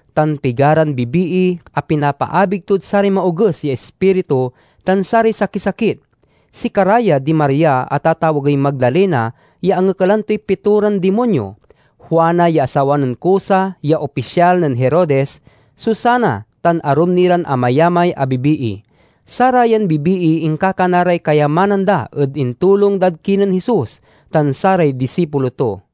tan pigaran bibii a pinapaabig tod saray maoges ya ispiritu tan saray sakisakit. Sikara ya di Maria a tatawagey Magdalena ya angekalan toy pitoran dimonyo, Juana ya asawa nen Cusa ya opisyal nen Herodes, Susana, tan arum ni ran amayamay a bibii. Sarayan bibii inkakana ray kayamanan da ed intulong dad kinen Jesus tan saray disipulo to.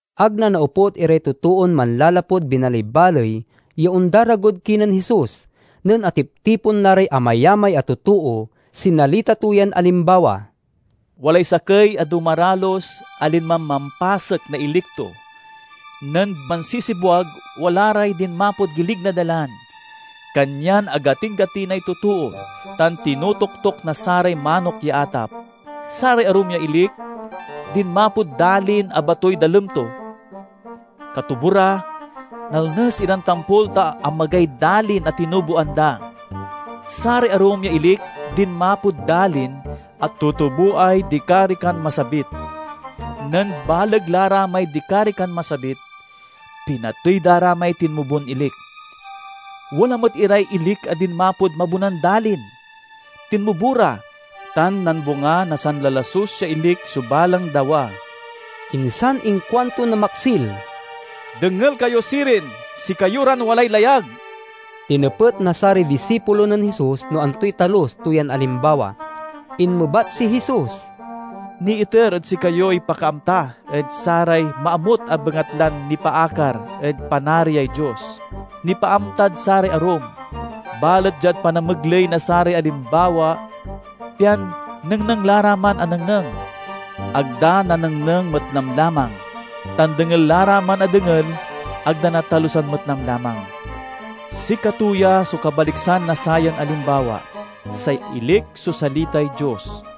Ag nanaoput iray totoon manlalapud binaleybaley ya ondaragod kinen Jesus. Nen atiptipon la ray amayamay a totoo, sinalita to yan alimbawa: "Walay sakey a dumaralus a linman mampasek na ilik to. Nen mansisibwag, wala ray dinmapod gilig na dalan, kanyan agatin-gatinay totoo tan tinotoktok na saray manok ya atap. Saray arum ya ilik, dinmapod dalin a batoy dalem to. Katubo ra, nalnes iran tampol ta amagay dalin a tinuboan da. Saray arum ya ilik dinmapod dalin a tutuboay dikarikan masabit. Nen baleg la ra may dikarikan masabit, pinatey da ra may tinmubon ilik. Wala met iray ilik a dinmapod mabonan dalin, tinmobo ra, tan nambunga na sanlalasus ya ilik so balang dawa." Insan inkuanto na maksil, "Dengel kayo sirin, sikayo ran walay layag!" Tinepet na saray disipulo nen Jesus no antoy talus to yan alimbawa. Inmebat si Jesus, "Niiter ed sikayoy pakaamta ed saray maamut a bengatlan nipaakar ed Panariay Dios. Nipaamtad saray arum, balet diad panamegley na saray alimbawa, pian nengneng la ra man a nengneng, ag da nanengneng met lamlamang; tan dengel la ra man a dengel, ag da natalusan met lamlamang." "Sikato ya so kabaliksan na sayan alimbawa: say ilik so salitay Dios.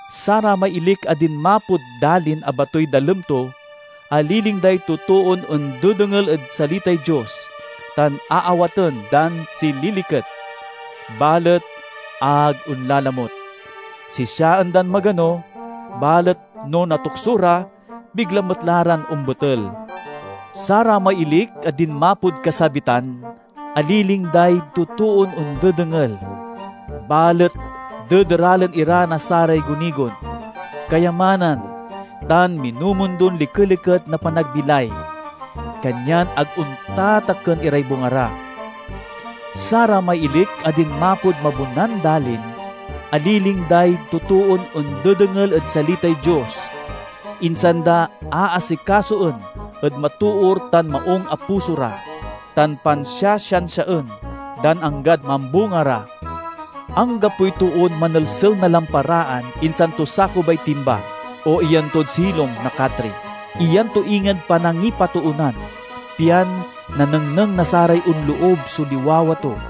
Saramay ilik a dinmapod dalin a batoy dalem to aliling day totoon ondedengel ed salitay Dios tan aawaten dan sililiket, balet ag onlalamut. Sisiaen da magano, balet no natukso ra, bigla met la ran ombetel. Saramay ilik a dinmapod kasabitan aliling day totoon ondedengel, balet dederalen ira na saray gunigon, kayamanan, tan minumundon likeliket na panagbilay, kanyan ag ontatakken iray bunga ra. Saramay ilik a dinmapod mabonan dalin aliling day totoon ondedengel ed salitay Dios, insan da aasikasoen ed matoor tan maung a puso ra, tan pansiasiansiaen dan anggad mambunga ra." "Anggapoy toon manelsel na lamparaan insan to sakubay timba, o iyan tod silong na katri. Iyan to inged panangipatoonan, pian nanengneng na saray onloob so liwawa to.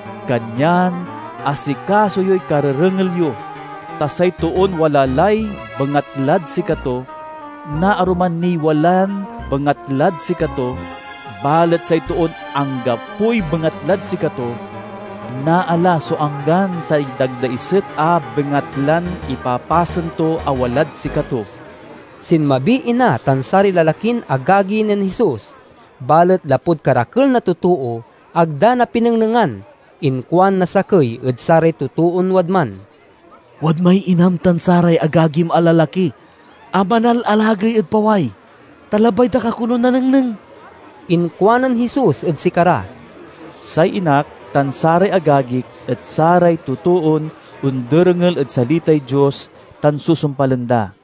"Kanyan asikaso yoy karerengel yo. Ta say toon wala lay bengatlad sikato, naaruman niy walan bengatlad sikato; balet say toon anggapoy bengatlad sikato, naala so anggan say dagdaiset a bengatlan ipapasen to a walad sikato." Sinmabiy ina tan saray lalakin agagi nen Jesus. Balet lapud karakel na totoo, ag da napinengnengan. Inkuan na sakey ed saray totoon wadman, "Wadmay inam tan saray agagim a lalaki a manalalagey ed paway, ta labay da ka konon nanengneng." Inkuanen Jesus ed sikara, "Say inak tan saray agagik et saray totoon onderengel ed salitay Dios tan susumpalen da."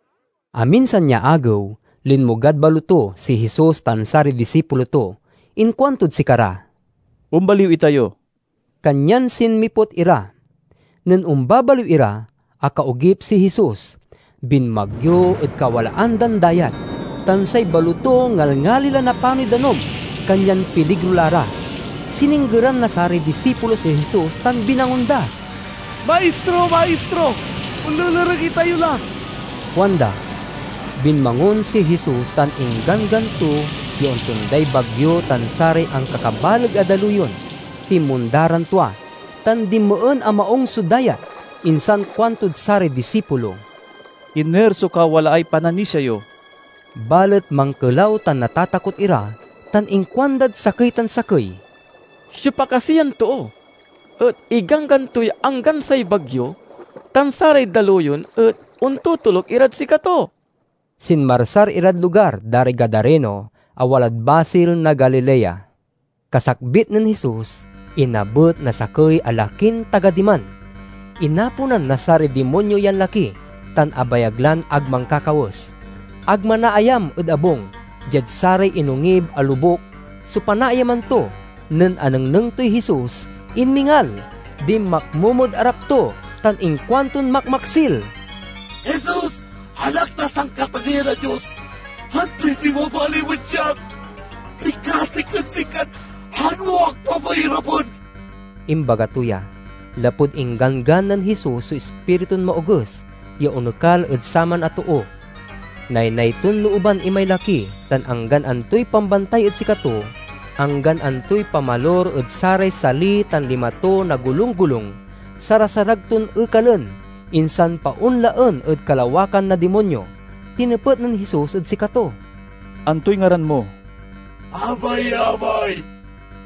Aminsan ya agew, linmogad baloto si Jesus tan saray disipulo to. Inkuantod sikara, "Ombaliw itayo." Kanyan sinmiput ira. Nen ombabaliw ira, akaogip si Jesus. Binmagyo ed kawalaan dan dayat, tan say baloto ngalngali la napanoy danum, kanyan piligro la ra. Sininggeran na saray disipulo si Jesus tan binangon da. "Maistro, Maistro, onlelereg itayo la!" kuanda. Binmangon si Jesus tan ingganggan to ya ontonday bagyo tan saray ankakabaleg a daluyon. Tinmonda ran tua, tan dinmeen a maung so dayat. Insan kuantod saray disipulo, "Iner so kawalaay pananisia yo?" Balet mankelaw tan natatakot ira, tan inkuandad sakey tan sakey. "Siopa kasi yan too et igganggan toy anggan say bagyo tan saray daluyon, et ontotoluk irad sikato?" Sinmarsar irad lugar da ray Gadareno, a walad basil na Galilea. Kasakbit nen Jesus, inabet na sakey a lakin taga diman. Inaponan na saray dimonyo yan laki, tan abayag lan ag mankakawes. Ag manaayam ed abung; diad saray inongib a lobuk so panaayaman to. Nen anengneng toy Jesus, inmingal, dinmakmomod arap to, tan inkuanton makmaksil, "Jesus, Anak na Sankatageyan a Dios! Antoy pibabalim ed siak? Pikasik ed sikan ag mo ak papairapen!" Imbaga to ya, lapud ingganggan nen Jesus so ispiritun maoges ya onekal ed saman a too. Naynay ton looban imay laki, tan anggan antoy pambantay ed sikato, anggan antoy pamalur ed saray sali tan lima to na golunggolung, sarasarag ton ekalen, insan paonlaen ed kalawakan na dimonyo. Tinepet nen Jesus ed sikato, "Antoy ngaran mo?" "Amayamay,"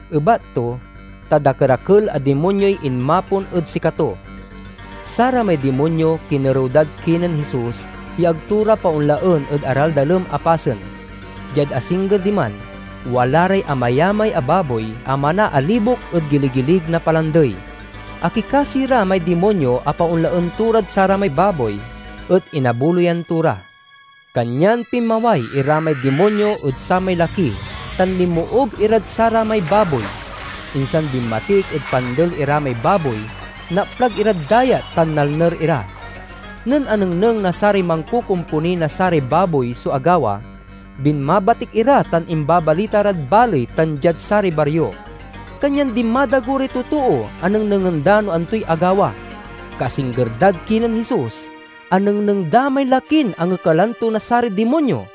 ebat to, ta dakerakel a dimonyoy inmapon ed sikato. Saramay dimonyo kinerew dad kinen Jesus ya ag to ra paonlaen ed araldalem a pasen. Diad asingger diman, wala ray amayamay a baboy a manaalibok ed giligilig na palandey. Akikasi ra may dimonyo a paonlaen to rad saramay baboy, et inabuloyan to ra. Kanyan pinmaway ira may dimonyo ed samay laki tan linmoob irad saramay baboy. Insan binmatik ed pandel ira may baboy, naplag irad dayat tan nalner ira. Nen anengneng na saray mankokomponi na saray baboy so agawa, binmatik ira tan imbabalita rad baley tan diad saray bario. Kanyan dinmadago ray totoo a nengnengen da no antoy agawa. Kaasingger dad kinen Jesus, anengneng da may lakin angekalan to na saray dimonyo.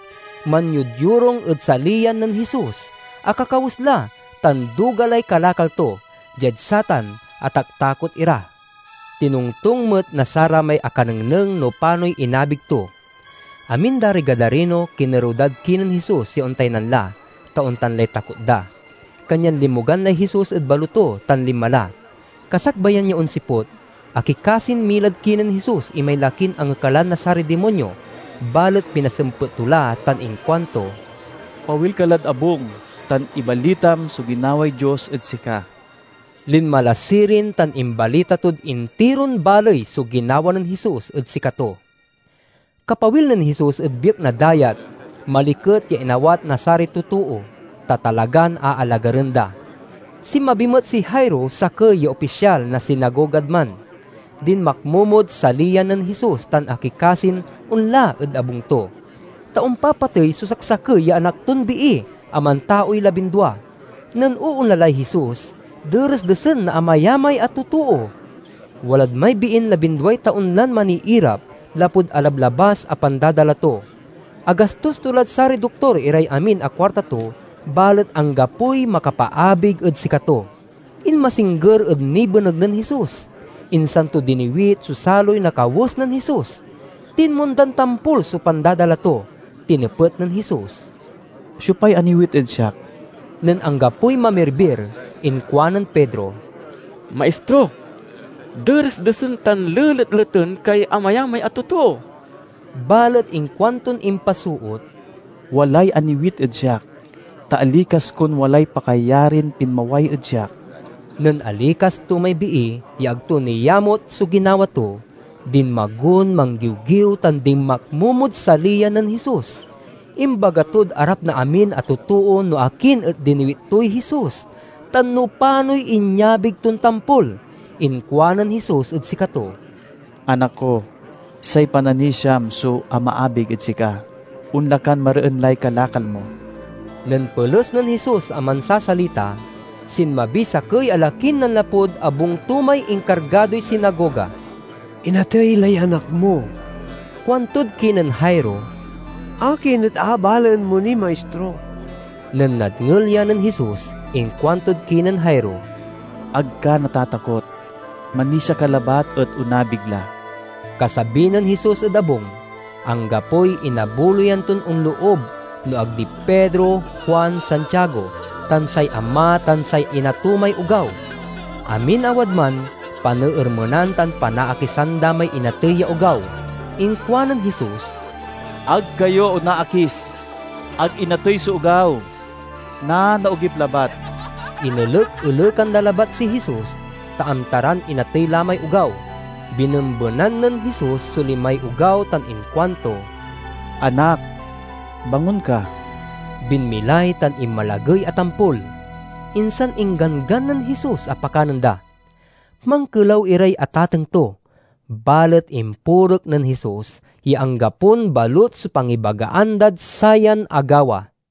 Manyodyorung ed saliyan nen Jesus, akakawes la, tan duga lay kalakal to. Diad satan, ataktakot ira. Tinongtong met na saramay akanengneng no panoy inabig to. Amin da ray Gadareno kinerew dad kinen Jesus ya ontaynan la, ta ontan lay takot da. Kanyan linmogan lay Jesus ed baloto tan linma la. Kasakbayan ya onsiput, akikasin milad kinen Jesus imay lakin angekelan na saray dimonyo. Balet pinasempet to la tan inkuanto, "Pawil ka lad abung, tan ibalitam so ginaway Dios ed sika." Linma la sirin tan imbalita tod intiron baley so ginawa nen Jesus ed sikato. Kapawil nen Jesus ed biek na dayat maliket ya inawat na saray totoo, ta talagan aalagaren da. Sinmabi met si Jairo, sakey ya opisyal na sinagogad man. Dinmakmomod saliyan nen Jesus tan akikasin onla ed abung to, ta ompapatey so saksakey ya anak ton bii a mantaoy labindua. Nen oonla lay Jesus, deresdesen na amayamay a totoo. Walad may biin labinduay taon la maniirap lapud alablabas a pandadala to. Agastos to lad saray doktor iray amin a kuarta to, balet anggapoy makapaabig ed sikato. Inmasingger ed nibeneg nen Jesus, insan to diniwit so saloy na kawes nen Jesus. Tinmondan tampol so pandadala to. Tinepet nen Jesus, "Siopay aniwit ed siak?" Nen anggapoy mamirbir, inkuanen Pedro, "Maistro, deresdesen tan leletleten kay amayamay a totoo!" Balet inkuanton impasoot, "Walay aniwit ed siak, ta alikas kon walay pakayarin pinmaway ed siak." Nen alikas to may bii ya ag to niamut so ginawa to, dinmagon manggiwgiw tan dinmakmomod saliyan nen Jesus. Imbaga tod arap na amin a totoo no akin et diniwit toy Jesus, tan no panoy inyabig ton tampol. Inkuanen Jesus ed sikato, "Anak ko, say pananisiam so amaabig ed sika. Onla kan mareen lay kalakal mo!" Nen peles nen Jesus a mansasalita, sinmabiy sakey a lakin nanlapud abung to may inkargadoy sinagoga. "Inatey lay anak mo," kuantod kinen Jairo, "akin et aabalaen mo niy Maistro?" Nen nadngel ya nen Jesus, inkuantod kinen Jairo, "Ag ka natatakot. Manisia ka labat et onabig la." Kasabi nen Jesus ed abung, anggapoy inabuloyan ton onloob no ag di Pedro, Juan, Santiago, tan say ama tan say ina to may ogaw. Amin a wadman paneermenan tan panaakisan da may inatey ya ogaw. Inkuanen Jesus, "Ag kayo onaakis. Ag inatey so ogaw; nanaogip labat!" Inelek-elekan da labat si Jesus, ta amta ran inatey la may ogaw. Binembenan nen Jesus so limay ogaw tan inkuanto, "Anak, bangon ka!" Binmilay tan inmalagey a tampol. Insan ingganggan nen Jesus a pakanen da. Mankelaw iray atateng to, balet impurek nen Jesus ya anggapon balut so pangibagaan dad sayan agawa.